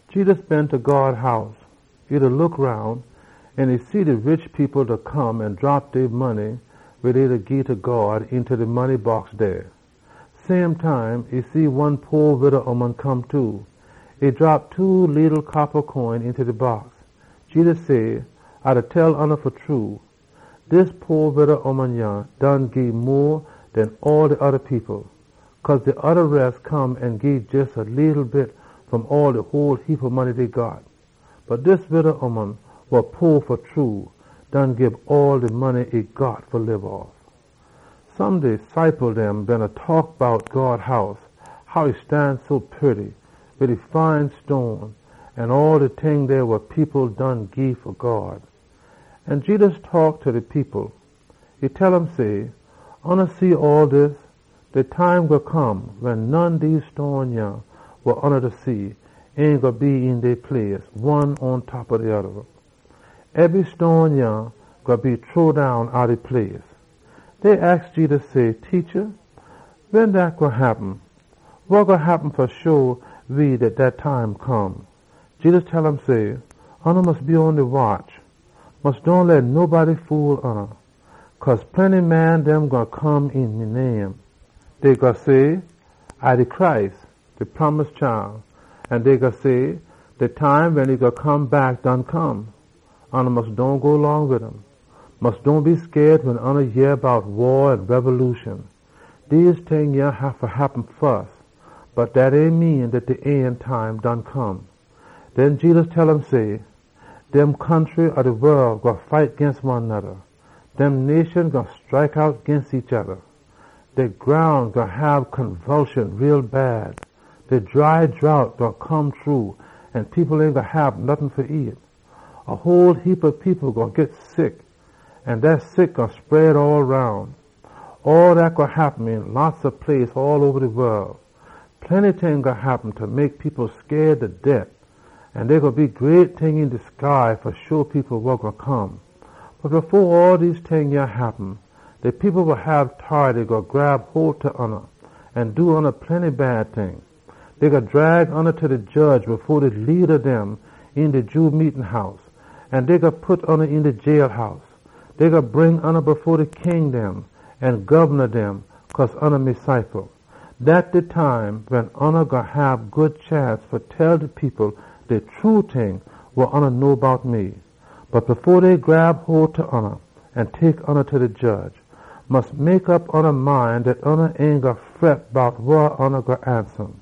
Jedus been ta God House. E beena look roun, an e see de rich people come an drop dey money wa dey da gii ta God eenta de money box dey. Same time e see one po wida ooman come too. E drop two leetle coppa coin eenta de box. Jedus say, “A da tell oona fa true, dis po wida ooman yah done gii mo den all de oda people. Cause de oda res come an gii jes a leetle bit fom all de whole heapa money dey got. Bot dis ooman wa too po done gii all de money e got fa lib off.” Some de ciple dem beena taak bout God House, how e stan so purty, wid e fine stone an all de ting dey wa people done gii fa God. Jedus say, “Oona see all dis? De time gwine come wen none dese stone yah wa oona da see ain gwine be lef een dey place, one pontop de oda. Ebry stone yah gwine be chunk down outta e place.” Dey aks Jedus say, “Teacha, wen dat gwine happen? Wa sign gwine show we dat time done come?” Jedus tell um say, “Oona mus be on de watch. Mus dohn leh nobody fool oona. Cause plenty man dem gwine come een me name. Dey gwine say, ‘A de Messiah!’ An dey gwine say, ‘De time done come!’ Oona mus dohn go long wid dem. Mus dohn be scaid wen oona yeh bout waa an rebolution. Dem ting haffa happen fus, bot dat ain mean dat de end time done come.” Den Jedus tell um say, “De country dem ob de wol gwine fight ginst one noda. Nation gwine scrike out ginst oda nation. De groun gwine shake too bad. A dry drought gwine come shru an people ain gwine hab nottin fa nyam. A whole heapa people gwine git sick an dat sick gwine spread all roun. All dat gwine happen een plenty place all oba de wol. Plenty ting gwine happen fa mek people scaid ta det, an dey gwine be great ting een de sky fa sho people wa gwine come. Bot fo all dem ting happen, de people wa hab tority gwine grab hole ta oona an do oona plenty bad ting. Dey gwine drag oona fa be jedge fo de leada dem een de Jew meetin house, an dey gwine pit oona een de jailhouse. Dey gwine bring oona fo king dem an gobna dem cause oona me ciple dem. Dat de time dey wen oona gwine hab good chance fa tell de people de true ting wa oona know bout me. Bot fo dey grab hole ta oona an tek oona fa be jedge, mus mek op ya mind dat ya ain gwine fret bout wa ya gwine ansa um.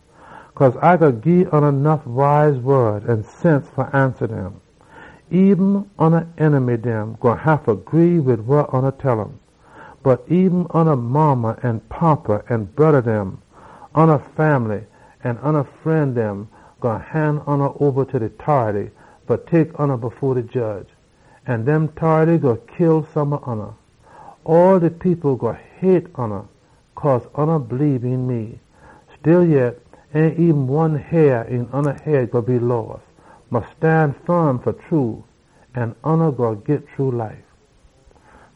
Cause A gwine gii ya nuff wise wod an sense fa ansa dem. Eben oona enemy dem gwine haffa gree wid wa ya tell um. Bot eben ya modda an fada, ya broda dem, ya fambly, an ya fren dem gwine han ya oba ta de tority fa tek ya fo de jedge. An dem tority gwine kill some ob oona. All de people gwine hate oona cause oona bleebe een me. Stillyet, ain eben one hair een oona head gwine be loss. Mus stan firm, an oona gwine git true life.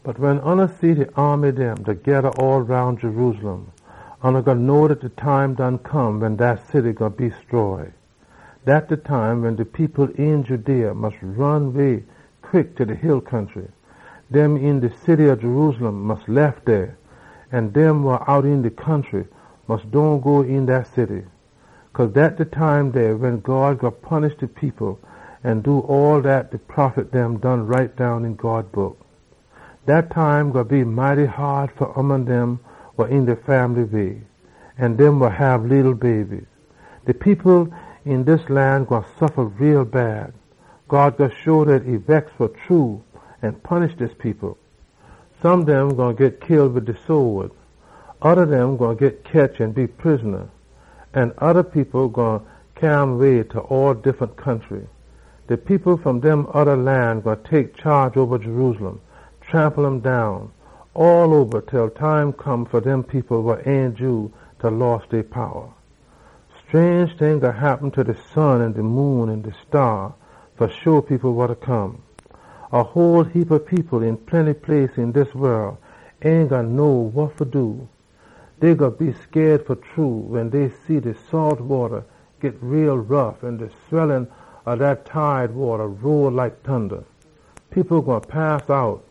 “Bot wen oona see de aamy dem da geda all roun Jerusalem, oona gwine know dat de time done come wen dat city gwine be stroy. Dat de time wen de people een Judea mus ron way quick ta de hill country. Dem een de city ob Jerusalem mus lef dey, an dem wa out een de country mus dohn go eenta dat city. Cause dat de time dey wen God gwine punish de people an do all dat de prophet dem done write down een God Book. Dat time gwine be mighty haad fa ooman dem wa een de fambly way an dem wa hab leetle baby! De people een dis lan gwine suffa too bad. God gwine show dat e bex fa true an punish dis people. Some dem gwine git kill wid de sode. Oda dem gwine git ketch an be prisona, an oda people gwine cyaa um way ta all de diffunt country dem. De people fom dem oda lan gwine tek chaage oba Jerusalem, trample um down all oba til de time come fa dem people wa ain Jew fa loss dey powa. “Scrange ting gwine happen ta de sun an de moon an de staa fa sho people wa da come. A whole heapa people een plenty place een dis wol ain gwine know wa fa do. Dey gwine be scaid fa true wen dey see de salt wata git rough an de swellin ob dat tide wata roll like tunda. People gwine pass out.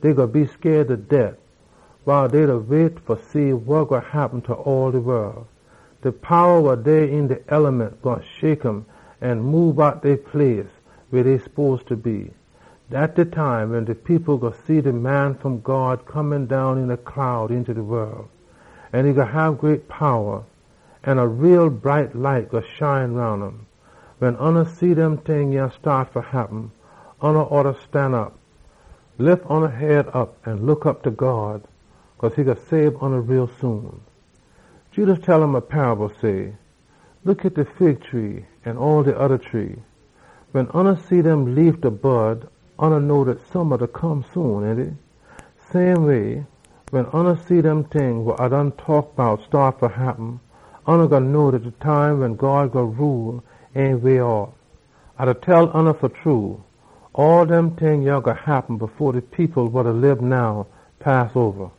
Dey gwine be scaid ta det, wiles dey da wait fa see wa gwine happen ta all de wol. De powa wa dey een de eliment gwine shake an moob outta dey place weh dey spose fa be. Dat de time wen de people gwine see de Man wa Come fom God da come down een a cloud eenta de wol. E gwine hab great powa, an a too bright light gwine shine roun um. Wen oona see dem ting staat fa happen, oona oughta stanop. Look op ta God, cause e gwine sabe oona soon.” Jedus tell um a paable, say, “Look at de fig tree an all de oda tree dem. Wen oona see dem leaf da buss open, oona know dat summa gwine come soon, ainty? Same way, wen oona see dem ting wa A done taak bout staat fa happen, oona gwine know dat de time wen God gwine rule ain way off. “A da tell oona fa true, all dem ting yah gwine happen fo de people wa da lib now pass oba.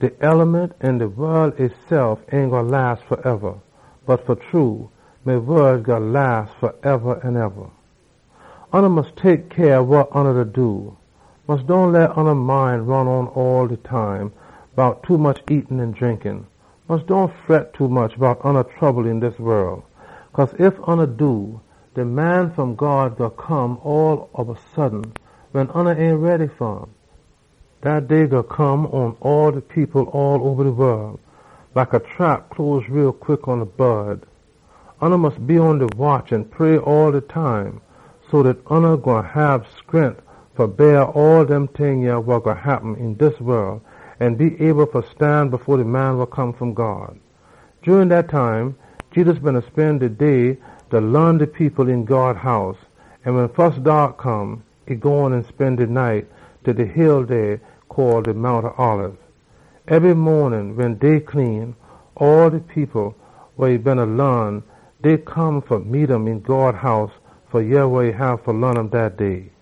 De eliment an de wol esef ain gwine las faeba, bot me wod gwine las faeba an eba. “Oona mus tek cyah wa oona da do. Mus dohn leh oona mind ron on all de time bout tommuch nyam an drink. Mus dohn fret tommuch bout oona trouble een dis wol. Cause ef oona do, dat day gwine come all ob a sudden, wen oona ain ready. Dat day gwine come pon all de people all oba de wol, like a trap close quick pon a bod. Oona mus be on de watch an pray all de time so dat oona gwine hab scrent fa beah all dem ting wa gwine happen een dis wol an be able fa stan fo de Man wa Come fom God.” Jurin dat time, Jedus beena spen de day da laan de people een God House, an wen fus daak come, e gone an spen de night ta de Mount Olib. Ebry maanin wen day clean, all de people wa e beena laan, dey gone fa meet um een God House fa yeh wa e gwine laan um dat day.